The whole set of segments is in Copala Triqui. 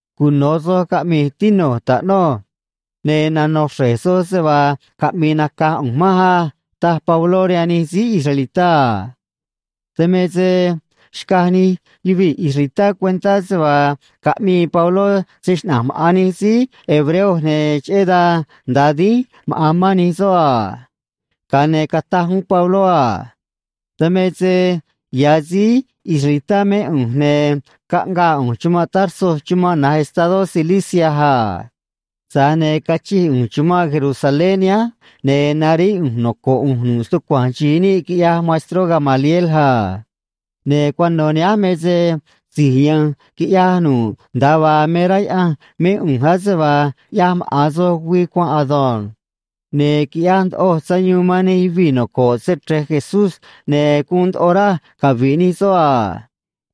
―Cuno̱ soj caꞌmi̱j, tinu̱j, taꞌnuj. Ne̱ nano̱ xre̱j soj se vaa caꞌmi̱i̱ naca̱j ꞌu̱nj manj á ―taj Pabló rihaan nij síí israelitá a. Dan me se xcaj nij yuvii̱ israelitá cuentá se vaa caꞌmii Pabló se‑xnaꞌa̱nj maꞌa̱n nij síí hebreo, ne̱ cheꞌé dan nda̱a dínj maꞌa̱n mán nij soꞌ a. Ga̱a ne̱ cataj uún Pabló a: ―Dan me se ya̱ síí israelitá mé ꞌu̱nj, ne̱ caꞌngaa ꞌu̱nj chumanꞌ Tarso chumanꞌ na̱j estadó Cilicia a. Tza̱j ne̱ cachij ꞌu̱nj chumanꞌ Jerusalén nihánj, ne̱ naríꞌ ꞌu̱nj noco̱ꞌ ꞌu̱nj nu̱ꞌ stucua̱nj xi̱i níꞌ, quiꞌyaj maestró Gamaliel a. Ne̱ cuano̱ nihánj me se si̱j ya̱nj quiꞌya̱j nu̱ꞌ nda̱a vaa me rá Yaꞌanj mé ꞌu̱nj ase vaa ꞌyaj maꞌa̱n soj güii cuanꞌ ado̱nj. Ne̱ quiꞌyaj ndoꞌoj sayuun man nij yuvii̱ noco̱ꞌ Se‑Chre̱j Jesús, ne̱ guun ndoꞌo raj cavi̱ꞌ nij soꞌ a.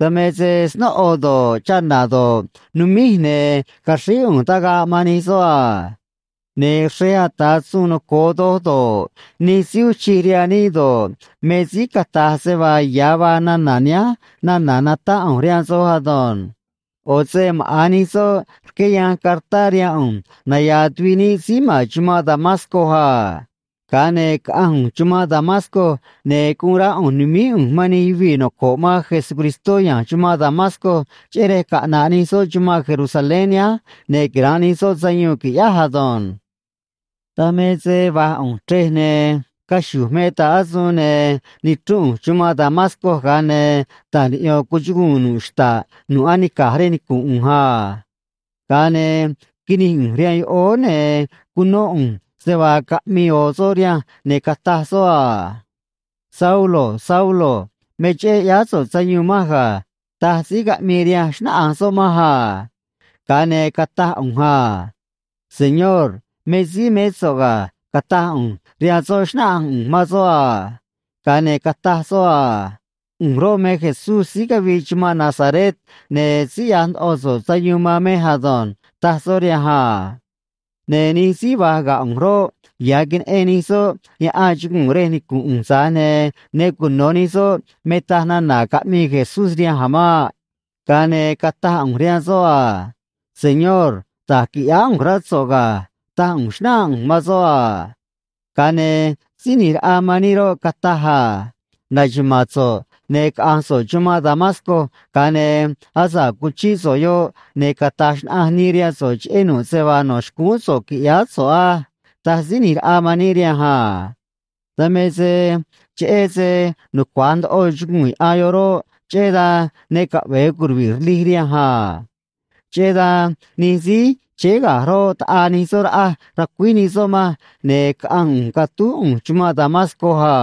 Dan me se snóꞌo do̱ꞌ, chana̱ do̱ꞌ, numíj, ne̱ caxríj ꞌu̱nj tagaꞌ man nij soꞌ a. Ne̱ xrej ata̱ suun noco̱o doj do̱ꞌ, nij síí uun chij rihaan níꞌ do̱ꞌ, me síí cata̱j se vaa ya̱ vaa nana̱ nihánj nana̱ natáꞌ ꞌu̱nj rihaan soj ado̱nj. ꞌO̱ se maꞌa̱n nij soꞌ rqué yanj cartá rihaan ꞌu̱nj naya̱a̱ tuviꞌ níꞌ síí ma̱n chumanꞌ Damasco a. Ga̱a ne̱ caꞌanj ꞌu̱nj chumanꞌ Damasco, ne̱ guun rá ꞌu̱nj nu̱míj ꞌu̱nj man nij yuvii̱ noco̱ꞌ man Jesucristó ya̱nj chumanꞌ Damasco, cheꞌé rej caꞌna̱ꞌ nij soꞌ chumanꞌ Jerusalén nihánj ne̱ quira̱nꞌ nij soꞌ sayuun, qui̱ꞌyáj ado̱nj. ’Dan me se va̱j ꞌu̱nj chrej, ne̱ caxu̱j me ta̱ꞌ asuun, ne̱ nichrúnꞌ ꞌu̱nj chumanꞌ Damasco, ga̱a ne̱ ta̱j niꞌyo̱n cuchuguu̱n nu̱ꞌ xta̱ꞌ nu̱ꞌ anica̱j rej nicu̱nꞌ ꞌu̱nj a. Ga̱a ne̱ quinij ꞌu̱nj rihaan yoꞌóó, ne̱ cunó ꞌu̱nj se vaa caꞌmii ꞌo̱ soꞌ rihanj, ne̱ cataj soꞌ a: “Saulo, Saulo, me cheꞌé ꞌyáá so̱ꞌ sayuun manj ga̱”, taj síí caꞌmii rihanj, xnáꞌanj soꞌ manj a. Ga̱a ne̱ cataj ꞌu̱nj a: “Señor, me síí mé so̱ꞌ ga̱”, cataj ꞌu̱nj rihaan soꞌ, xnáꞌanj ꞌu̱nj man soꞌ a. Ga̱a ne̱ cataj soꞌ a: “ꞌU̱nj roꞌ, me Jesús síí cavii chumanꞌ Nazaret, ne̱ síí ꞌyaj ndoꞌo so̱ꞌ sayuun man mej ado̱nj”, taj soꞌ rihanj a. Ne̱ nij síí va̱j ga̱ ꞌu̱nj roꞌ, ya̱ queneꞌen nij soꞌ yaꞌan chuguu̱n rej nicu̱nꞌ ꞌu̱nj, tza̱j ne̱ ne cuno̱ nij soꞌ me taj nana̱ caꞌmii Jesús rihanj a̱ maꞌ. Ga̱a ne̱ cataj ꞌu̱nj rihaan soꞌ a: “Señor, da̱j qui̱ꞌyáá ꞌu̱nj, rá so̱ꞌ ga̱”, taj ꞌu̱nj, xnáꞌanj ꞌu̱nj man soꞌ a. Ga̱a ne̱ Síí ꞌNi̱j Raꞌa man níꞌ roꞌ, cataj a: “Na̱xuma̱a̱n so̱ꞌ, ne̱ caꞌa̱nj so̱ꞌ chumanꞌ Damasco, ga̱a ne̱ asa̱ꞌ cuchíꞌ so̱ꞌ yoꞌ, ne̱ cata̱j xnaꞌanj nii rihaan so̱ꞌ cheꞌé nu̱ꞌ se vaa no̱ xcúún so̱ꞌ qui̱ꞌyáá so̱ꞌ á”, taj Síí ꞌNi̱j Raꞌa man níꞌ rihanj a. Dan me se cheꞌé se nucua̱j ndoꞌo chuguu̱n yaꞌan yoꞌ roꞌ, cheꞌé dan ne caꞌve̱e curuvi̱ꞌ rlij rihanj a. Cheꞌé dan nij síí chéé ga̱j roꞌ, taꞌaa nij soꞌ raꞌaj, racuíj nij soꞌ manj, ne̱ caꞌanj ꞌu̱nj catúj ꞌu̱nj chumanꞌ Damasco a.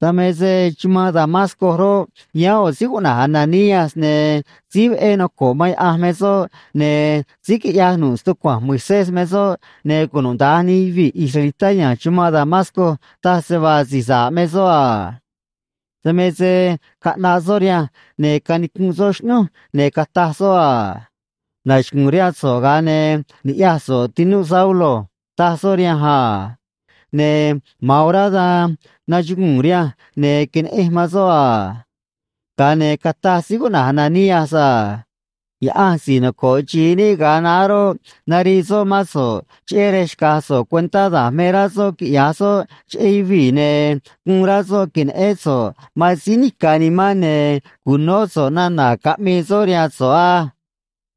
’Dan me se chumanꞌ Damasco roꞌ, yáán ꞌo̱ síí cuꞌna̱j Ananías, ne̱ síí veꞌé noco̱ꞌ man Yaꞌanj me soꞌ, ne̱ síí quiꞌyaj nu̱ꞌ stucua̱nj Moisés me soꞌ, ne̱ cunuda̱nj nij yuvii̱ israelitá ya̱nj chumanꞌ Damasco taj se vaa si̱j sa̱ꞌ me soꞌ a. Dan me se caꞌnaꞌ soꞌ rihanj ne̱ canicunꞌ soꞌ xꞌnúj, ne̱ cataj soꞌ a: “Nachugu̱u̱n rihaan so̱ꞌ, ga̱a ne̱ ni̱ꞌyaj so̱ꞌ, tinu̱j Saulo”, taj soꞌ rihanj a. Ne̱ ma̱an orá dan nachuguu̱n rihanj, ne̱ queneꞌenj man soꞌ a. Ga̱a ne̱ cataj síí cuꞌna̱j Ananías a: “Yaꞌanj si̱j noco̱ꞌ xi̱i níꞌ ga̱a naá roꞌ, narii soꞌ mán so̱ꞌ cheꞌé rej xca̱j so̱ꞌ cuentá da̱j me rá soꞌ quiꞌya̱j soꞌ cheꞌé yuvii̱, ne̱ guun rá soꞌ que̱neꞌén so̱ꞌ man Síí Nica̱ Nimán ne̱ cu̱nó so̱ꞌ nana̱ caꞌmii soꞌ rihaan so̱ꞌ á.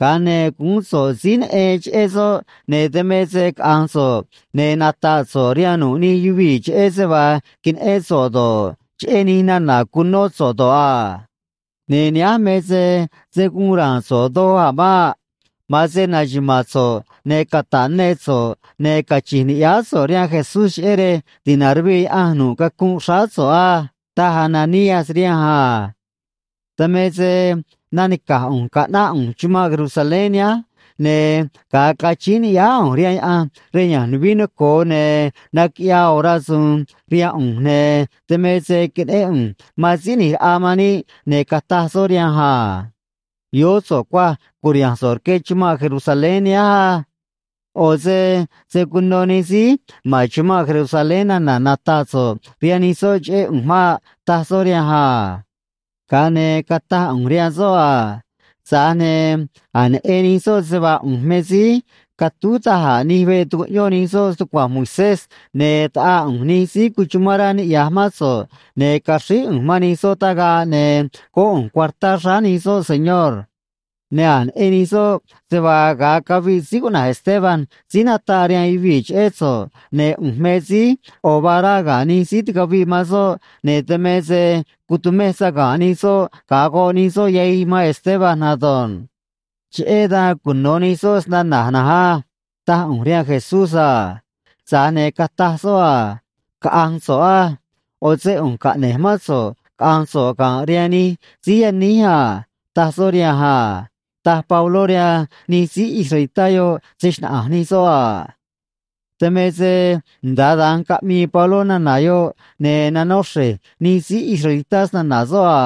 Ga̱a ne̱ guún so̱ꞌ síí neꞌen cheꞌé soꞌ, ne̱ dan me se caꞌa̱nj so̱ꞌ, ne̱ nata̱ꞌ so̱ꞌ rihaan nu̱ꞌ nij yuvii̱ cheꞌé se vaa queneꞌén so̱ꞌ do̱ꞌ, cheꞌé nij nana̱ cunó so̱ꞌ do̱ꞌ a. Ne̱ nihánj me se se̱ guun ra̱a̱n so̱ꞌ doj a̱ maꞌ. Ma̱an se na̱xuma̱a̱n so̱ꞌ, ne̱ cata̱ꞌ ne so̱ꞌ, ne̱ cachi̱nj ni̱ꞌyáá so̱ꞌ rihaan Jesús cheꞌé rej ti̱naruvii Yaꞌanj nu̱ꞌ cacunꞌ xráá so̱ꞌ á”, taj Ananías rihanj a. ’Dan me se nanica̱j ꞌu̱nj caꞌnáꞌ ꞌu̱nj chumanꞌ Jerusalén nihánj, ne̱ ga̱a cachíín ni̱ꞌyáá ꞌu̱nj rihaan Yaꞌanj rej ya̱nj nuvií noco̱o, ne̱ naquiꞌyaa ꞌo̱ rasu̱u̱n rihaan ꞌu̱nj, ne̱ dan me se queneꞌén ꞌu̱nj man Síí ꞌNi̱j Raꞌa man níꞌ, ne̱ cataj soꞌ rihanj a: “Yoó so̱ꞌ cuaj, cu̱riha̱nj so̱ꞌ rque chumanꞌ Jerusalén nihánj á. ꞌO̱ se se̱ cuno nij síí ma̱n chumanꞌ Jerusalén nana̱ nata̱ꞌ so̱ꞌ rihaan nij soꞌ cheꞌé ꞌu̱nj maꞌ”, taj soꞌ rihanj a. Ga̱a ne̱ cataj ꞌu̱nj rihaan soꞌ a: “Tza̱j ne̱ a̱j neꞌen nij soꞌ se vaa ꞌu̱nj me síí catúj da̱j a̱ nij veꞌ tucuꞌyón nij soꞌ stucua̱nj Moisés, ne̱ taꞌaa ꞌu̱nj nij síí cuchumán rá niꞌya̱j mán so̱ꞌ, ne̱ caxríj ꞌu̱nj man nij soꞌ tagaꞌ ne̱ góꞌ ꞌu̱nj cuartá xráá nij soꞌ, Señor. Ne̱ a̱j neꞌen nij soꞌ se vaa, ga̱a caviꞌ síí cuꞌna̱j Esteban síí nataꞌ rihaan yuvii̱ cheꞌé so̱ꞌ, ne̱ ꞌu̱nj me síí ꞌo̱ vaa rá ga̱ nij síí ticaviꞌ man soꞌ, ne̱ dan me se cutumej saga̱nꞌ nij soꞌ ga̱a goꞌ nij soꞌ yahij man Esteban ado̱nj. Cheꞌé dan cuno̱ nij soꞌ snana̱j na̱nj á”, taj ꞌu̱nj rihaan Jesús a. Tza̱j ne̱ cataj soꞌ a: “Caꞌa̱nj so̱ꞌ á. ꞌO̱ se ꞌu̱nj caꞌne̱j mán so̱ꞌ caꞌa̱nj so̱ꞌ ga̱nꞌ rihaan nij síí yaníj a”, taj soꞌ rihanj a ―taj Pabló rihaan nij síí israelitá yoꞌ se‑xnaꞌa̱nj nij soꞌ a. Dan me se nda̱a dan caꞌmii Pabló nana̱ yoꞌ, ne̱ nanó xre̱j nij síí israelitá snana̱ soꞌ a.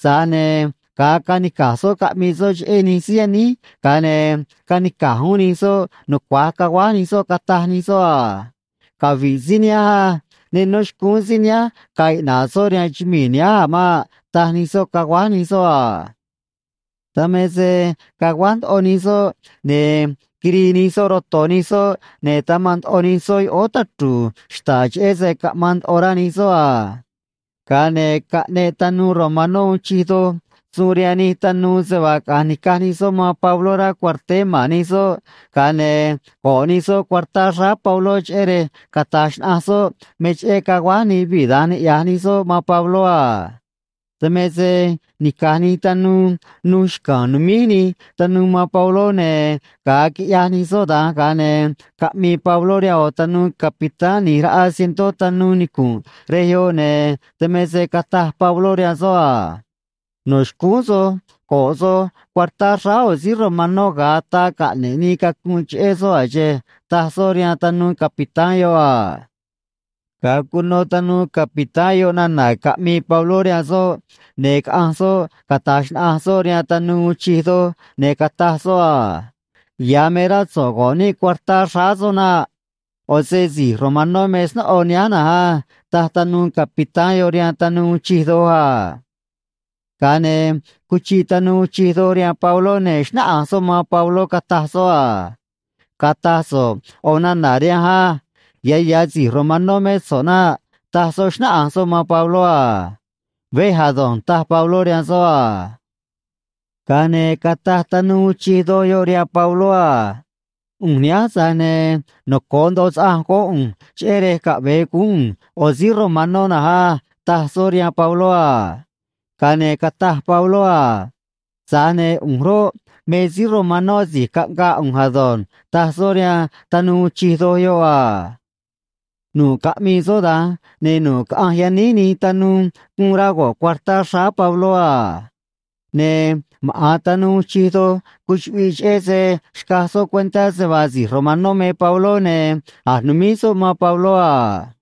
Tza̱j ne̱ ga̱a canica̱j soꞌ caꞌmii soꞌ cheꞌé nij síí yaníj, ga̱a ne̱ canica̱j uún nij soꞌ, nucua̱j caguáj nij soꞌ, cataj nij soꞌ a: ―Cavi̱ꞌ síí nihánj á. Ne nó xcúún síí nihánj ga̱a̱ iꞌna̱ꞌ soꞌ rihaan chumii̱ nihánj a̱ maꞌ ―taj nij soꞌ, caguáj nij soꞌ a. Dan me se caguáj ndoꞌo nij soꞌ, ne̱ quirii nij soꞌ roto̱ nij soꞌ, ne̱ tamanꞌ ndoꞌo nij soꞌ yoꞌóó tachru̱u̱ xta̱ꞌ cheꞌé se caꞌmaan ndoꞌo rá nij soꞌ a. Ga̱a ne̱ caꞌneꞌ tanuu romanó uun chij doj suun rihaan nij tanuu se vaa caꞌa̱nj ni̱caj nij soꞌ man Pabló rá cuarteé ma̱n nij soꞌ, ga̱a ne̱ go̱ꞌ nij soꞌ cuartá xráá Pabló, cheꞌé rej cata̱j xnaꞌanj soꞌ me cheꞌé caguáj nij yuvii̱ da̱nj niꞌya̱j nij soꞌ man Pabló a. Dan me se nica̱j nij tanuu nuj xca̱a̱n, numíj nij tanuu man Pabló, ne̱ ga̱a quiꞌyaj nij soꞌ da̱nj, ga̱a ne̱ caꞌmii Pabló rihaan ꞌo̱ tanuu capitán ꞌni̱j raꞌa cientó tanuu nicu̱nꞌ rej yoꞌ, ne̱ dan me se cataj Pabló rihaan soꞌ a: ―No̱ xcúún soj go̱ꞌ soj cuartá xráá ꞌo̱ síí romanó ga̱a ataa caꞌne̱ꞌ nii cacunꞌ cheꞌé soꞌ a̱ xe̱e̱ ―taj soꞌ rihaan tanuu capitán yoꞌ a. Ga̱a cuno tanuu capitán yoꞌ nana̱ caꞌmii Pabló rihaan soꞌ, ne̱ caꞌanj soꞌ cata̱j xnaꞌanj soꞌ rihaan tanuu uun chij doj, ne̱ cataj soꞌ a: ―Ya̱ me rá so̱ꞌ go̱ꞌ níꞌ cuartá xráá soꞌ naꞌ. ꞌO̱ se si̱j romanó me snóꞌo nihánj na̱nj á ―taj tanuu capitán yoꞌ rihaan tanuu uun chij doj a. Ga̱a ne̱ cuchiꞌ tanuu uun chij doj rihaan Pabló, ne̱ xnáꞌanj soꞌ man Pabló, cataj soꞌ a: ―Cata̱j so̱ꞌ ꞌo̱ nana̱ rihanj á. Ya̱ ya̱ si̱j romanó mé so̱ꞌ naꞌ ―taj soꞌ, xnáꞌanj soꞌ man Pabló a. ―Vej ado̱nj ―taj Pabló rihaan soꞌ a. Ga̱a ne̱ cataj tanuu uun chij doj yoꞌ rihaan Pabló a: ―ꞌU̱nj nihánj, tza̱j ne̱ noco̱o ndoꞌo saꞌanj góꞌ ꞌu̱nj cheꞌé rej caꞌve̱e guún ꞌu̱nj ꞌo̱ síí romanó na̱nj á ―taj soꞌ rihaan Pabló a. Ga̱a ne̱ cataj Pabló a: ―Tza̱j ne̱ ꞌu̱nj roꞌ, me síí romanó asi̱j caꞌngaa ꞌu̱nj ado̱nj ―taj soꞌ rihaan tanuu uun chij doj yoꞌ a. Nu̱ꞌ caꞌmii soꞌ da̱nj, ne̱ nu̱ꞌ caꞌanj yaníj nij tanuu guun rá go̱ꞌ cuartá xráá Pabló a. Ne̱ maꞌa̱n tanuu uun chij doj cuchuꞌviꞌ, cheꞌé se xcaj soꞌ cuentá se vaa si̱j romanó me Pabló ne̱ a̱j numíj soꞌ man Pabló a.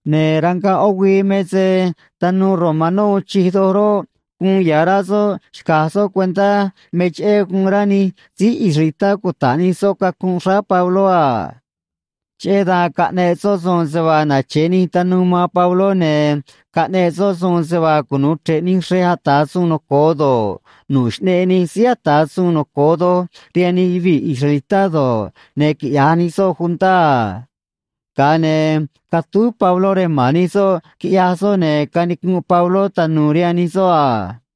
Ne̱ rangaꞌ ꞌó güii me se tanuu romanó uun chij doj roꞌ, guun ya̱ rá soꞌ xca̱j soꞌ cuentá me cheꞌé guun rá nij síí israelitá cuta̱ꞌ nij soꞌ cacunꞌ xráá Pabló a. Cheꞌé dan caꞌneꞌ soꞌ suun se vaa nache̱ nij tanuu man Pabló, ne̱ caꞌneꞌ soꞌ suun se vaa cunu̱u chre̱ꞌ nij xrej ata̱ suun noco̱o do̱ꞌ, nu̱ꞌ Xꞌneꞌ Nij Síí Ata̱ Suun Noco̱o Doj rihaan nij yuvii̱ israelitá do̱ꞌ, ne̱ quiꞌya̱j nij soꞌ juntá a. Ga̱a ne̱ catúj Pabló rej ma̱n nij soꞌ, quiꞌyaj soꞌ, ne̱ canicunꞌ Pabló tanu̱u̱ rihaan nij soꞌ a.